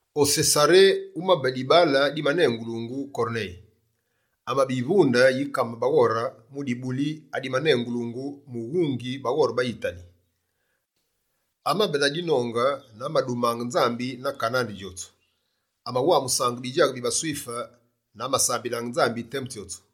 O Sesaré wumabe dibaale dimanengulungu Korneye. Amabe yivunde yi kame baghore mu dibuli adimanengulungu «Mughungi baghore ba Yitali.» Amabe na dinonge na amadumaange Nzambi na kane andi djotsu. Amawamusaange bidjaghe bi baSwife na amasambilaange Nzambi temu tsyotsu.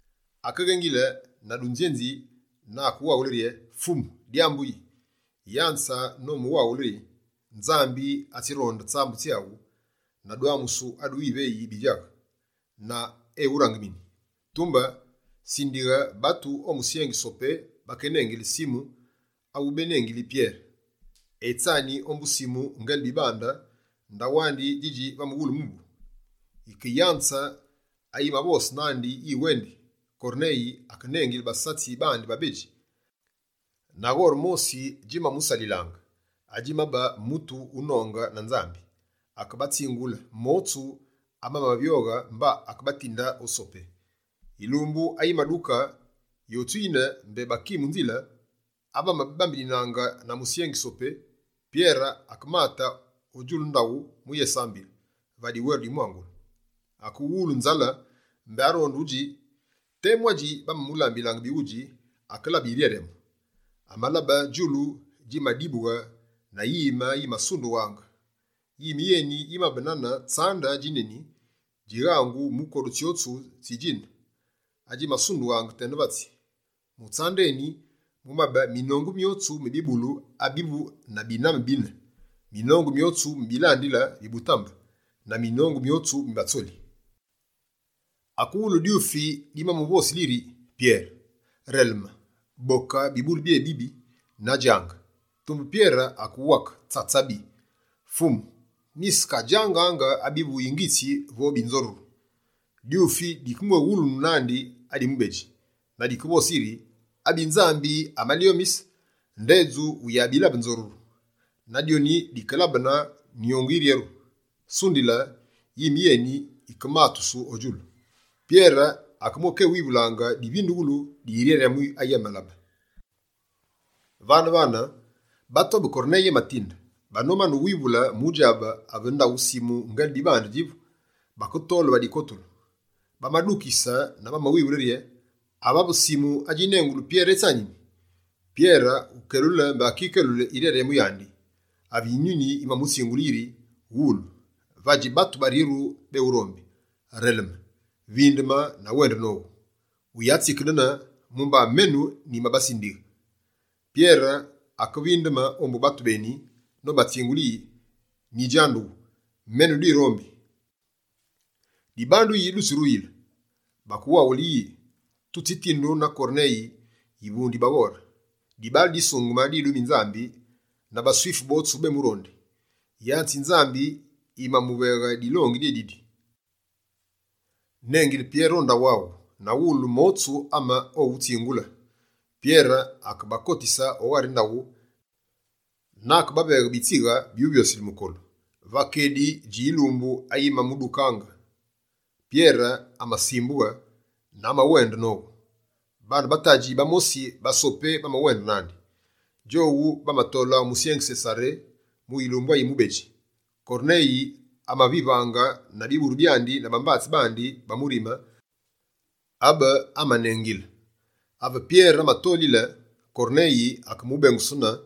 Akeghengile na dunzyenzi na akewaghule rye: «Fumu, dyambu yi?» Yanze nomuwaghule yi: «Nzambi atsironde tsambu tsyaghu na dwamusu adu wiveyi bidjaghe, na eghurangemini. Tumbe, sindighe batu o musyengi Sopé, bakénengile Simu awu bénengili Pyere. Etsani ombu Simu Ngele-Bibande, ndaghu andi djidji va mughule mubu.» Yike yanze ayimavose nandi yiwendi, Korneye akenengile basatsi bandi babedji na ghore mosi djimamusalilaange, adjimabe mutu wunonge na Nzambi. Akebatsingule motsu amamavyoghe mba akebatinde o Sopé. Yilumbu ayimaduke, yotsu yine mbé baki mu nzile ave bamabambeninaange na musyengi Sopé, Pyere akemate o djulu ndaghu mu yésambile, va diweru di mwangulu. Akewulu nzale, mbé aronde udji. Temu adji bamamulambilaange bighudji, akelabe yiryaryamu. Amalabe djulu djimadibughe, na yime yimasundughaange. Yime yeni yimabe nane yibuku yi tsande djineni, djighangu mu kodu tsyotsu tsi djine, adjimasundughe tena vatsi. Mu tsande eni, mumabe minongu myotsu mi bibulu abivu na biname bina, minongu myotsu mi bilandile bi butambe, na minongu myotsu mi batsoli. Akewulu dyufi dimamuvosile yiri: «Pyere, releme! Boke bibulu byébibi na djange!» Tumbe Pyere akewake: «Tsatsabi! Fumu ami, nyisekadjangaange abivu yingitsi vo binzoruru.» Dyufi dikemwéghulunu nandi adi mubedji, na dikevose yiri: «Abi Nzambi amalyomise, ndedju wuyabilabe nzoruru.» Dyoni dimalabene kumbu yiryeru, mba yime yeni yikematusu o djulu. Pyere amakewivulaange divindughulu di yiryaryamu ayi abenolabe. Vane-vane, batu abe Korneye amatinde, banomane uwivule mu djabe ave ndaghu Simu Ngele-Bibande djivu, baketole va dikotulu. Bamadukise na bamawivule rye: «Avave Simu adjinengulu Pyere etsanini?» Pyere wukelule mbé akikelule yiryaryamu yandi, ave Yinyuni yimamutsingulile yiri: «Wulu, vadji batu baryeru béwurombi. Releme, vindeme na wende nowu, wuyatsikedene, mumba menu nyibasindiyi.» Pyere akevindeme ombu batu beni nobatsingule yi: «Nyidjandughu, menu dirombi. Dibandu yi dutsiruyile?» Bakewaghule yi: «Tutsitindu na Korneye, yivunde yi baghore. Dibaale disungeme, didumi Nzambi, na baSwife botsu bémurondi. Yanze yi Nzambi yimayimuveghe dilongi dyédidi: “Nengile Pyere o ndaghu aghu na wulu motsu ame owutsingule.”» Pyere akebakotise o ghari ndaghu na akebaveghe bitsighe byuvyosile mukolu. Pyere ewendi ombu Korneye Va kedi dji yilumbu ayimadukaange, Pyere amasimbughe na amawende nowu. Baane ba tadji bamosi ba Sopé bamawende nandi. Djowu bamatole o musyengi Sesaré mu yilumbu ayi mubedji. Korneye amabavivaange na biburu byandi na bambatsi bandi ba murime, abe amanengile. Ave Pyere amatolile, Korneye akémubengusunu,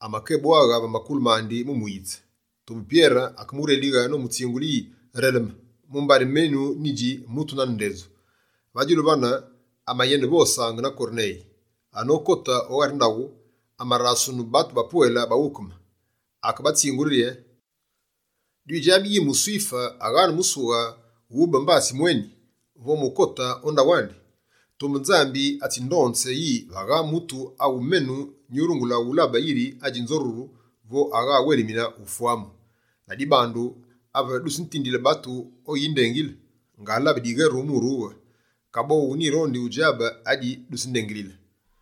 amakébwaghe va makulu mandi mu muyitse. Tumbe Pyere akemurelighe nomutsingule yi: «Releme! Mumbari menu nyidji mutu nane ndedju.» Va djulu vane, amayenevosaange na Korneye. Anokote o ghari ndaghu, amarasunu batu bapwele baghukeme. Akebatsingule rye: «Dwidjabi yi muSwife aghane musughe wube mbatsi mweni, vo mu ukote o ndaghu andi. Tumbe Nzambi atsindonze yi, vagha mutu awu menu nyurungule wulabe yiri adji nzoruru vo agha awelimine ufwamu. Ladibandu, ave dutsitindile batu o wuyindengile, ngalabe diweru mu urughe. Kaboghu, nyirondi udjabe adi dutsindengilile.»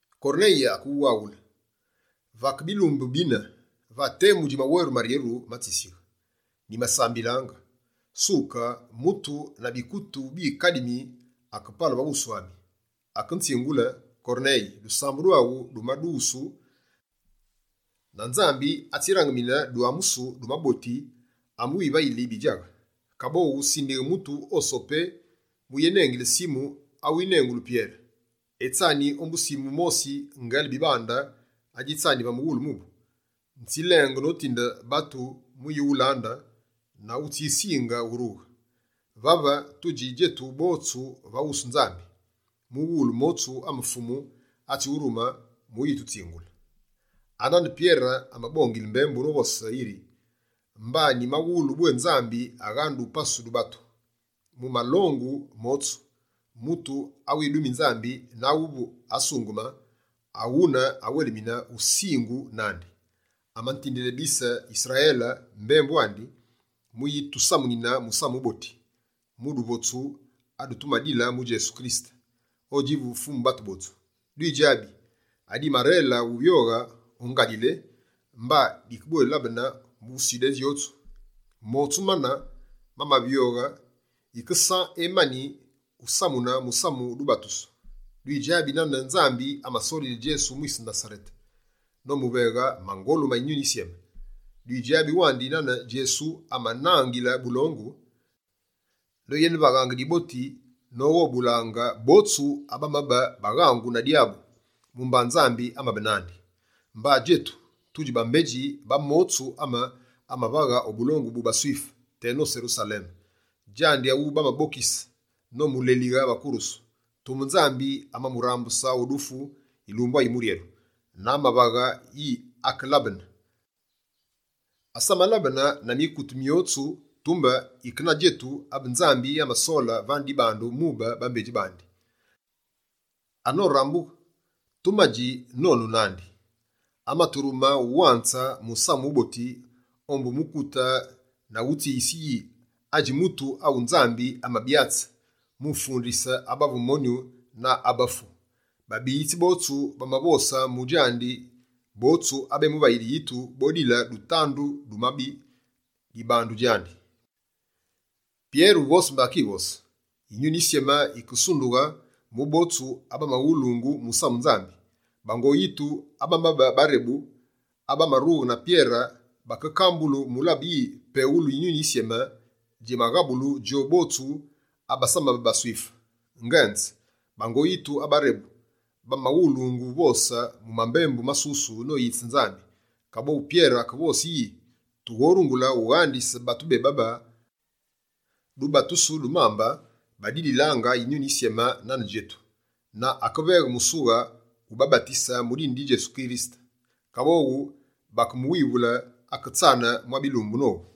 Korneye akewaghule yiri: «Vake bilumbu bina, va temu dji maweru maryeru ma tsisighe, nyimasambilaange. Suka, mutu na bikutu bikademi akepale va wusu ami. Akenzingule: “Korneye, dusambu dwaghu dumadughusu, na Nzambi atsirangemine dwamusu du maboti amewivayili bidjaghe. Kaboghu sindighe mutu o Sopé mu uyenengile Simu awu bénengili Pyere. Etsani ombu Simu mosi, Ngele-Bibande adjitsani va mughule mubu.” Nzilenge notinde batu mu yiwulande na wutsisinge urughe. Vave, tudji djetu botsu va wusu Nzambi, mughulu motsu ame Fumu atsiwurume mu yitutsingule.» Anane Pyere amabongile mbembu novose yiri: «Mba nyimawulu bwé Nzambi aghane dupasu du batu. Mu malongu motsu, mutu awidumi Nzambi na avu asungeme, awune awelimine usingu nandi. Amatindile bise Yisrayele mbembu andi, mu yitusamune Musamu Wuboti wu duvotsu adutumadile mu Djesu Kirisete, odjivu Fumu batu botsu. Dwidjabi adimarele uvyoghe o Ngalile, mba dikebwélabene mu Sudé djotsu. Motsu mane mamavyoyile, yike San emani usamune musamu wu dubatusu. Dwidjabi nane Nzambi amasolile Djesu mwise Nasarete, nomuveghe mangolu ma Yinyuni Yisyeme. Dwidjabi wandi nane Djesu amanangile bulongu, noyenevaghaange diboti noghobulaange botsu abamabe baghangu na dyabu, mumba Nzambi amabe nandi. Mba djetu, tudji bambedji ba motsu ame amavaghe o bulongu bu baSwife, teno Serusaleme. Djandi awu bamabokise, nomulelighe va kurusu. Tumbe Nzambi, amamurambuse o dufu yilumbu ayimuryeru, na amavaghe yi akelabene. Asamalabene na mikute myotsu, tumbe yike na djetu abe Nzambi amasole vane dibandu mube bambedji. Anorambughe, tumadji nonu nandi. Amaturume ulonze Musamu Wuboti, ombu mukute na utsiyise yi, adji mutu awu Nzambi amabyatse, mu ufundise abavu monyu na abafu. Babiyitsi botsu bamavose mu djandi, botsu abemuvayili yitu, bodile dutandu du mabi dibandu djandi.» Pyere uvose mbé akivose, Yinyuni Yisyeme yikesundughe mu botsu abamawulungu musamu Nzambi. Bango yitu abamabe barebu, abamarughe na Pyere, bakekambulu mu ulabe yi, peghulu Yinyuni Yisyeme djimaghabulu djowu botsu abasamabe baSwife. Ngenze, bango yitu abarebu, bamabawulungu uvose mu mambembu masusu noyitse Nzambi. Kaboghu Pyere akevose yi: «Tughorungule ughandise batu bébabe dubatusu du mambe, badililaange Yinyuni Yisyeme nane djetu!» Na akeveghe musughe ubabatise mu dine di Djesu Kirisete. Kaboghu bakemuwivule aketsane mwa bilumbu nowu.